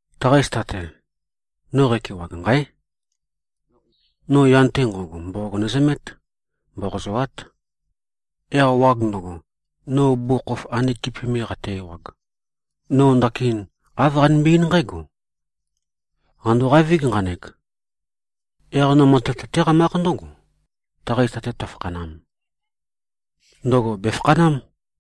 Taqa zita-te, no qækewag, nqáe! No yan-te nqo꞉go, mboqog nøzømét. Mboqozoát. Yaq wag ndøgo, no bugukhokhof ande kipi me qate-ewag, no ndakin āv qanømbe-eín nqǽgo, “Qàndoqavíg, nqanek. Yaq no matev tøtéqamákh ndǿgo, taqa zita-te tøfakhanam. Ndøgo bèfakhanám.”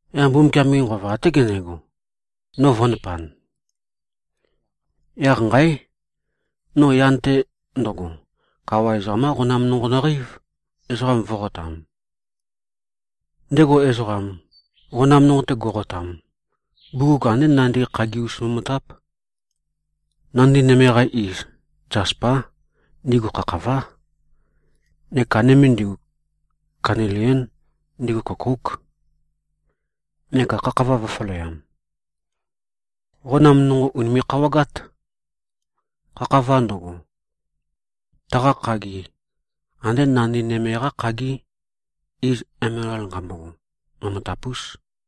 Yaq Mbumbukiam-ge Nqova, até gendego, no vø̄ndapan. Yaq nqáe! No yan-te ndøgo, kawa ezoqam-qá qonam nonqo nøqeív, ezoqam vó꞉qotam. Ndego ezoqam, qonam nonqo-te go꞉qotam, bugug andé nandi khagi-us momotáp. Nandi nøme-qa iz, zaspá. Ndigu khakhavá. Neka nøme ndigu, kanilién. Ndigu køkóuk. Neka khakhava vø̄faleam. Qonam nonqo ùnime꞉-khawagát. Khakhava ndøgo, taqa khagi andé nandi nøme-qá khagí, iz emelal nqambogo. Momotap-ús.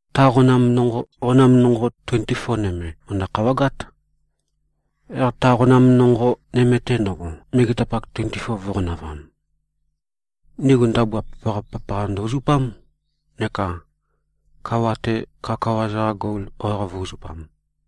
Ta qonam nonqo, qonam nonqo tuenti-foa nøme, mø̀ndø-khawagát, yaq ta qonam nonqo nøme-te ndo꞉go, megetapak tuenti-foa vō꞉qonavam. Ndigu ndabua papaqa-papaqa ndø-uzupám neka kawa-te, kawakawa-za-qa gol wawaq vō꞉-uzupam.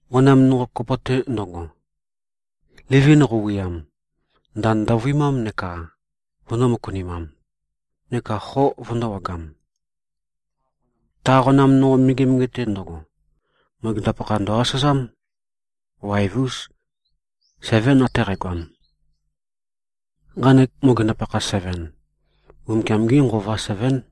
Qonam nonqo kopo-te ndøgo, livi qøuwuøyam, ndand ndovøimám neka vøndō-møkunimam, neka xo vøndōwagam. Ta qonam nonqo megemege-te ndo꞉go, mogenda-pakha ndø-asazám. Waev-ús. Sevén ate qægoam. Nqanek mogenda-pakha seven, Mbumbukiam-gí Nqova sevén.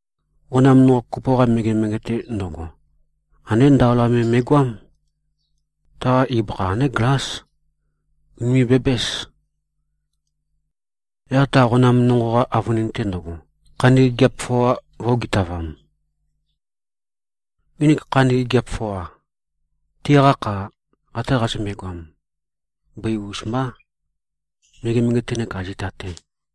Qonam nonqo kopo-qa megemege-te ndo꞉go, andé ndaola me me꞉goám. Taqa ibøkha andé glás. Ùnime꞉-bæbǽs. Yaq ta qonam nonqo-qa avønin-te ndøgo, khandi gigiap foa vø̄-ogitavam. Nginik khandi gigiap foa, tiqa kha ate qazømbe-goam, bøi-us mbá, megemege-te nekā zita-te.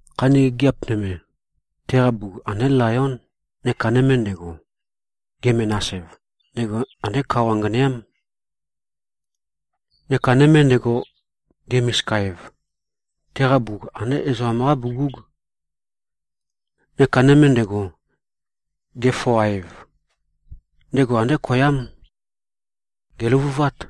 Khandi gigiap nøme, teqa bugug andé layón. Neka nøme ndego, ge-menas-ev, ndego andé kao anganeám. Neka nøme ndego, ge-misika-ev, teqa bugug, andé ezoqam-qá bugúg. Neka nøme ndego, ge-foa-ev, ndego andé koyám. Gèløvuvát.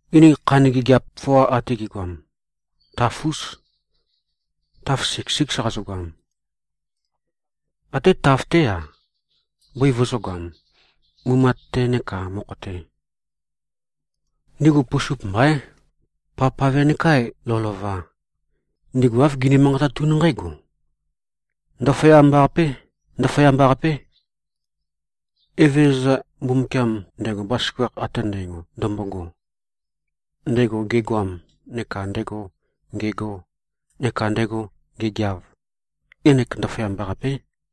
Nginik khandi gigiap foa ate gi꞉goam, taf-ús. Taf siks-síks qazøgoam. Até taf-té-a, bøi vøzø̄goam, mumat-te nekā mokho-te. Ndigu pusup mbaín. Pavpave nekā lovølova, ndigu āv gini-manqatatún nqǽgo, “Ndaføyamba-qapé. Ndaføyamba-qapé. Evezøza Mbumbukiam, ndego bazaføgakh ate ndægo ndømbogo, ndego gegoam neka ndego ngego neka ndego ngegeav, Ngenek ndaføyamba-qapé.”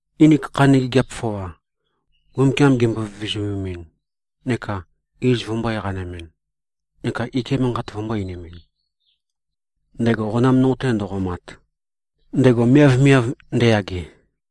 Nginik khandi gigiap foa, Mbumbukiam gimbo-vizumemin neka iz vømbō-eqanimin neka ike manqat vømbō-einimin, ndego qonam nonqo-te ndo꞉qomat, ndego miavmiav ndeyage,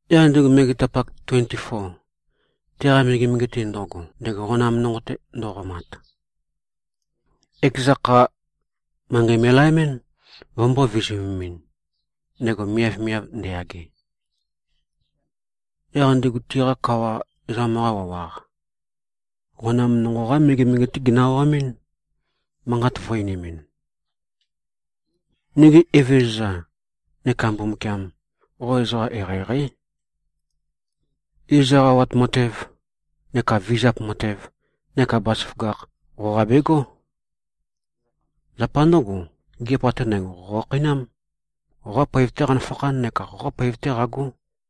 yaq ndigu megetapak tuenti-foa, teqa megemege-te ndo꞉go, ndego qonam nonqo-te ndo꞉qomat, ekeza kha, manqei me꞉laemɨ́n, vømbō-vizumemɨn, ndego miavmiav ndeyage. Yaq ndigu tiqa kawa ezoqam-qa wawaq, qonam nonqo-qá megemege-té ginø-awamɨ́n, manqat vø̄-einimɨn, “Nigi Evezøza neka Mbumbukiam! Qo ezoqa eqeieqeí. Iz eqawat matev neka vizap matev neka bazaføgakh, qoqa begó. Zapa ndǿgo, gigiap ate ndægo, qo qokhakheinám. Qoqá poev-té qanøfakhán neka qoqá poev-té qagó.”